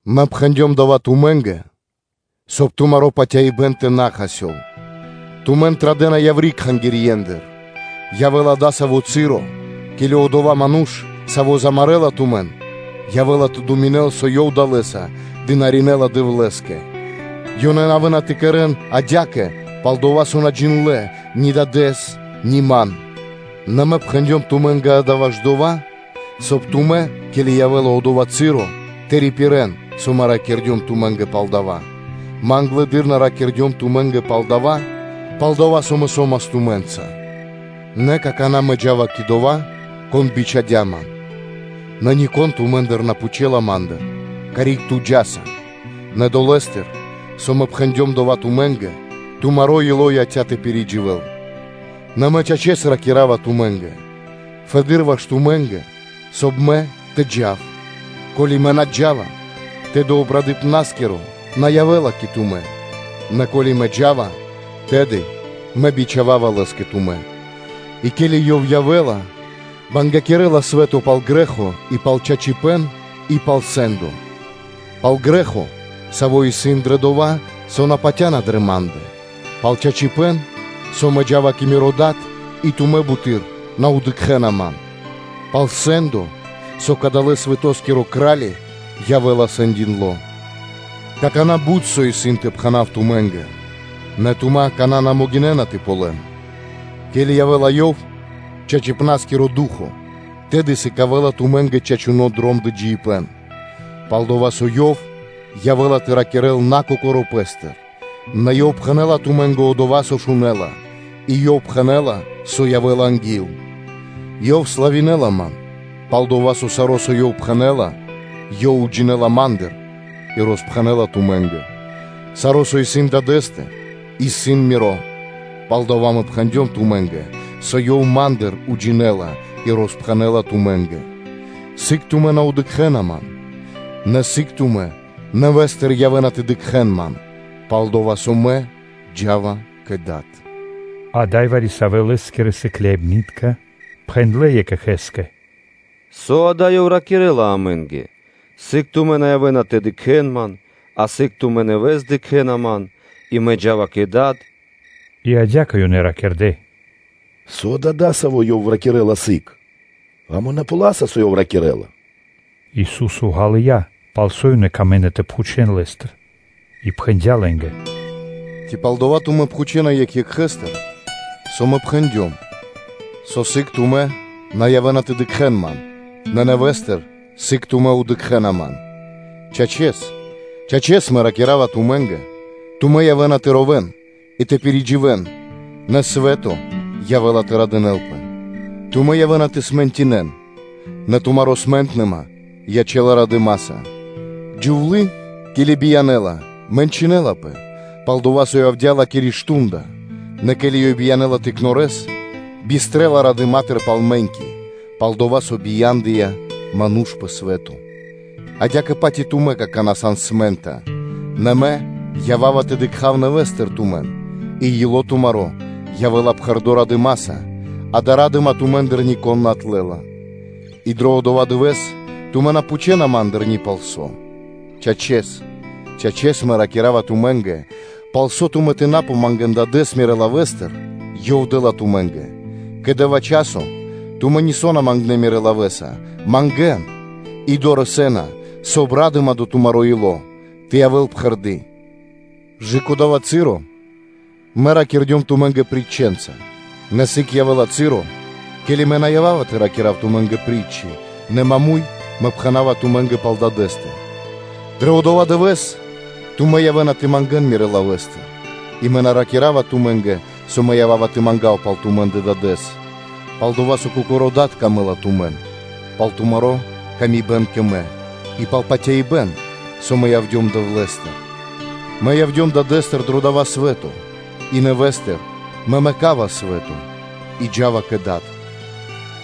Мэ пхэндём дава́ тумэ́нгэ, соб (кай) тумэ́ тэ на отпэрэн. Тумэн традэ́на яври́ кхангирьендыр; и явэ́ла дасаво часо (цы́ро), ке́ли одова́ ману́ш, саво́ замарэла тумэн, явэ́ла тэ думинэл, со ёв далэ́са дынаринэла Дэвлэ́скэ. Ёнэ явэ́на тэ кэрэ́н адя́кэ, пал-дова́ со адалэ́ мануша́ на джиндлэ́ ни Дадэ́с, ни Ман. Нэ Мэ пхэндём тумэ́нгэ дава́ ваш дова́, соб (кай) тумэ́, ке́ли явэ́ла одова́ часо, тэ рипирэ́н, со Мэ ракирдём тумэ́нгэ пал дава́; Мэ англэды́р на ракирдём тумэ́нгэ пал дава́, пал-дова́ со Мэ со́мас тумэ́нца. Нэ какана́ Мэ джа́ва кэ Одова́, Кон бичхадя́ Ман, нэ нико́н тумэ́ндыр на пхучэла Ма́ндыр: ‘Карик Ту джа́са?’ Нэ долэ́стыр, со Мэ пхэндём дова́ тумэ́нгэ, тумаро́ ило́ яця́ тэ пиридживэл. Нэ Мэ, чачэс, ракира́ва тумэ́нгэ: фэды́р ваш тумэ́нгэ, соб (кай) Мэ тэ джав; ко́ли Мэ на джа́ва, тэды Обрадыпнаскиро на явэ́ла кэ тумэ́, нэ ко́ли Мэ джа́ва, тэды Мэ бичхава́ва Лэс кэ тумэ́. И, ке́ли Ёв явэ́ла, бангякирэла свэ́то пал грэ́хо, и пал чачипэ́н, и пал сэ́ндо: пал грэ́хо, саво́ исын дрэ дова́, со мануша́ на патя́на дрэ Ма́ндэ; пал чачипэ́н, со Мэ джа́ва кэ Миро Дад, и тумэ́ буты́р на дыкхэ́на Ман; пал сэ́ндо, со кадалэ́ свэтоскиро кра́ли явэ́ла сэндиндло. Какана́ бут со исын тэ пхэна́в тумэ́нгэ, нэ тумэ́ акана́ на могинэ́на тэ ґалён. Ке́ли явэ́ла Ёв, чачипна́скиро Ду́хо (Фа́но), тэды сыкавэ́ла тумэ́нгэ чачуно́ дром дро джиибэ́н; пал-дова́ со Ёв явэ́ла тэ ракирэ́л на Кокоро́ Пэ́стыр, нэ Ёв пхэнэ́ла тумэ́нгэ одова́, со шунэ́ла, и Ёв пхэнэ́ла, со явэ́ла анги́л. Ёв славинэла Ман, пал-дова́ со саро́, со Ёв пхэнэ́ла, Ёв уджинэла Ма́ндыр и роспхэнэ́ла тумэ́нгэ. Саро́, со исын Дадэ́стэ, исын Миро. Палдава́ Мэ пхэндём тумэ́нгэ, со Ёв Ма́ндыр уджинэла и роспхэнэ́ла тумэ́нгэ. Сыг тумэ́ на дыкхэ́на Ман, нэ сыг тумэ́ нэвэ́стыр явэ́на тэ дыкхэ́н Ман; пал-дова́ со Мэ джа́ва кэ Дад.” Ада́й вари-савэ́ Лэ́скирэ сыкляибны́тка пхэндлэ́ екх екхэ́скэ: “Со дава́ Ёв ракирэ́ла амэ́нгэ: ‘Сыг тумэ́ на явэ́на тэ дыкхэ́н Ман’, а сыг тумэ́ нэвэ́с дыкхэ́на Ман, и: ‘Мэ джа́ва кэ Дад’?” И адя́кэ ёнэ ракирдэ́: “Со да дасаво Ёв ракирэ́ла: ‘Сыг?’ Амэ на ґалёваса, со Ёв ракирэ́ла.” Ису́со ґалыя́, пал со ёнэ камэ́на тэ пхучэ́н Лэ́стыр, и пхэндя́ лэ́нгэ: “Ци пал дова́ тумэ́ пхучэна екх екхэстыр, со Мэ пхэндём: ‘Со сыг тумэ́ на явэ́на тэ дыкхэ́н Ман, нэ нэвэ́стыр сыг тумэ́ дыкхэ́на Ман?’ Чачэс, чачэс ракира́ва Мэ тумэ́нгэ: тумэ́ явэ́на тэ ровэ́н и тэ пиридживэн, нэ свэ́то явэ́ла тэ радынэ́лпэ; тумэ́ явэ́на тэ смэнтнинэн (тэ тугинэн), нэ тумари́ смэнтныма ячэ́ла радыма́са. Джувлы́, ке́ли биянэ́ла, мэнчынэлапэ, пал-дова́ со явдя́ ла́киро мардо́ (шту́нда); нэ ке́ли ёй биянэ́ла тыкнорэс, бистрэла радыма́тыр пал мэ́ньки, пал-дова́ со бия́ндыя ману́ш пэ свэ́то. Адя́кэ-паць и тумэ́ какана́ сан смэнтна; нэ Мэ ява́ва тэ дыкха́в нэвэ́стыр тумэн, и ило́ тумаро́ явэ́ла пхэрдо́ радыма́са, дая́ ра́дыма тумэ́ндыр нико́н на отлэла. И дро одова́ дывэ́с тумэ́ на пхучэна Ма́ндыр ни пал со. Чачэс, чачэс Мэ ракира́ва тумэ́нгэ: пал со тумэ́ тэ на мангэ́н Дадэ́с Мирэ́ лавэ́стыр, Ёв дэ́ла тумэ́нгэ. Кэ дава́ часо тумэ́ нисо́ на мангнэ́ Мирэ́ лавэ́са, мангэ́н, и дорэсэ́на, соб (кай) ра́дыма дро тумаро́ ило́ тэ явэ́л пхэрды́. Кэ дава́ часо Мэ ракирдём тумэ́нгэ притчэнца, нэ сыг явэ́ла часо, ке́ли Мэ на ява́ва тэ ракира́в тумэ́нгэ притчы, нэ маму́й (прямэс) Мэ пхэна́ва тумэ́нгэ пал Дадэ́стэ. Дрэ одова́ дывэ́с тумэ́ явэ́на тэ мангэ́н Мирэ́ лавэ́стыр и Мэ на ракира́ва тумэ́нгэ, со Мэ ява́ва тэ мангав пал тумэ́ндэ Дадэ́с: пал-дова́ со Кокорэскэ Дадэ́скэ тумэ́ сан дро́га, пал тумари́ ла́ска кэ Мэ и пал патяибэ́н, со Мэ явдём Дэвлэ́стыр. Мэ явдём Дадэ́стыр дро дава́ свэ́то; и нэвэ́стыр Мэ мэкава свэ́то и джа́ва кэ Дад.”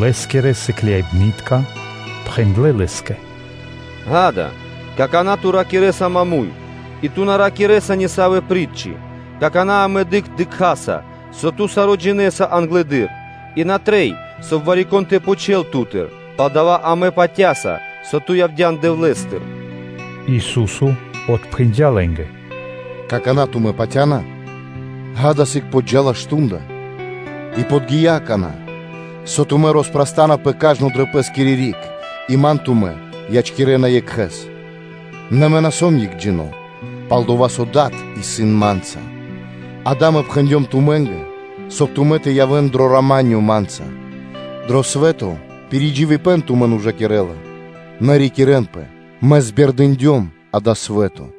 Лэ́скирэ сыкляибны́тка пхэндлэ́ Лэ́скэ: “Ѓа́да, какана́ Ту ракирэ́са маму́й, и Ту на ракирэ́са нисавэ притчы!” Какана́ амэ дыкхаса, со Ту саро́ джинэ́са англэды́р, и на трэй, соб (кай) вари-кон тэ пхучэл Ту́тыр; палдава́ амэ патя́са, со Ту явдя́н Дэвлэ́стыр.” Ису́со отпхэндя́ лэ́нгэ: “Какана́ тумэ́ патя́на? Ѓа́да, сыг подджа́ла мардо́ (шту́нда), и подги́я какана́, со тумэ́ роспрастанапэ кажно дрэ пэ́скири риг и Ман тумэ́ ячкирэна Екхэ́с; нэ Мэ на сом Екхджино́, пал-дова́ со Дад исын Ма́нца; ґа́да, Мэ пхэндём тумэ́нгэ, соб (кай) тумэ́ тэ явэ́н дро рама́нё Ма́нца. Дро свэ́то мэ́ньки тумэн ужакирэ́на; нэ рикирэнпэ муршканэ́с: Мэ збердындём (пиризорьякирдём) дава́ свэ́то”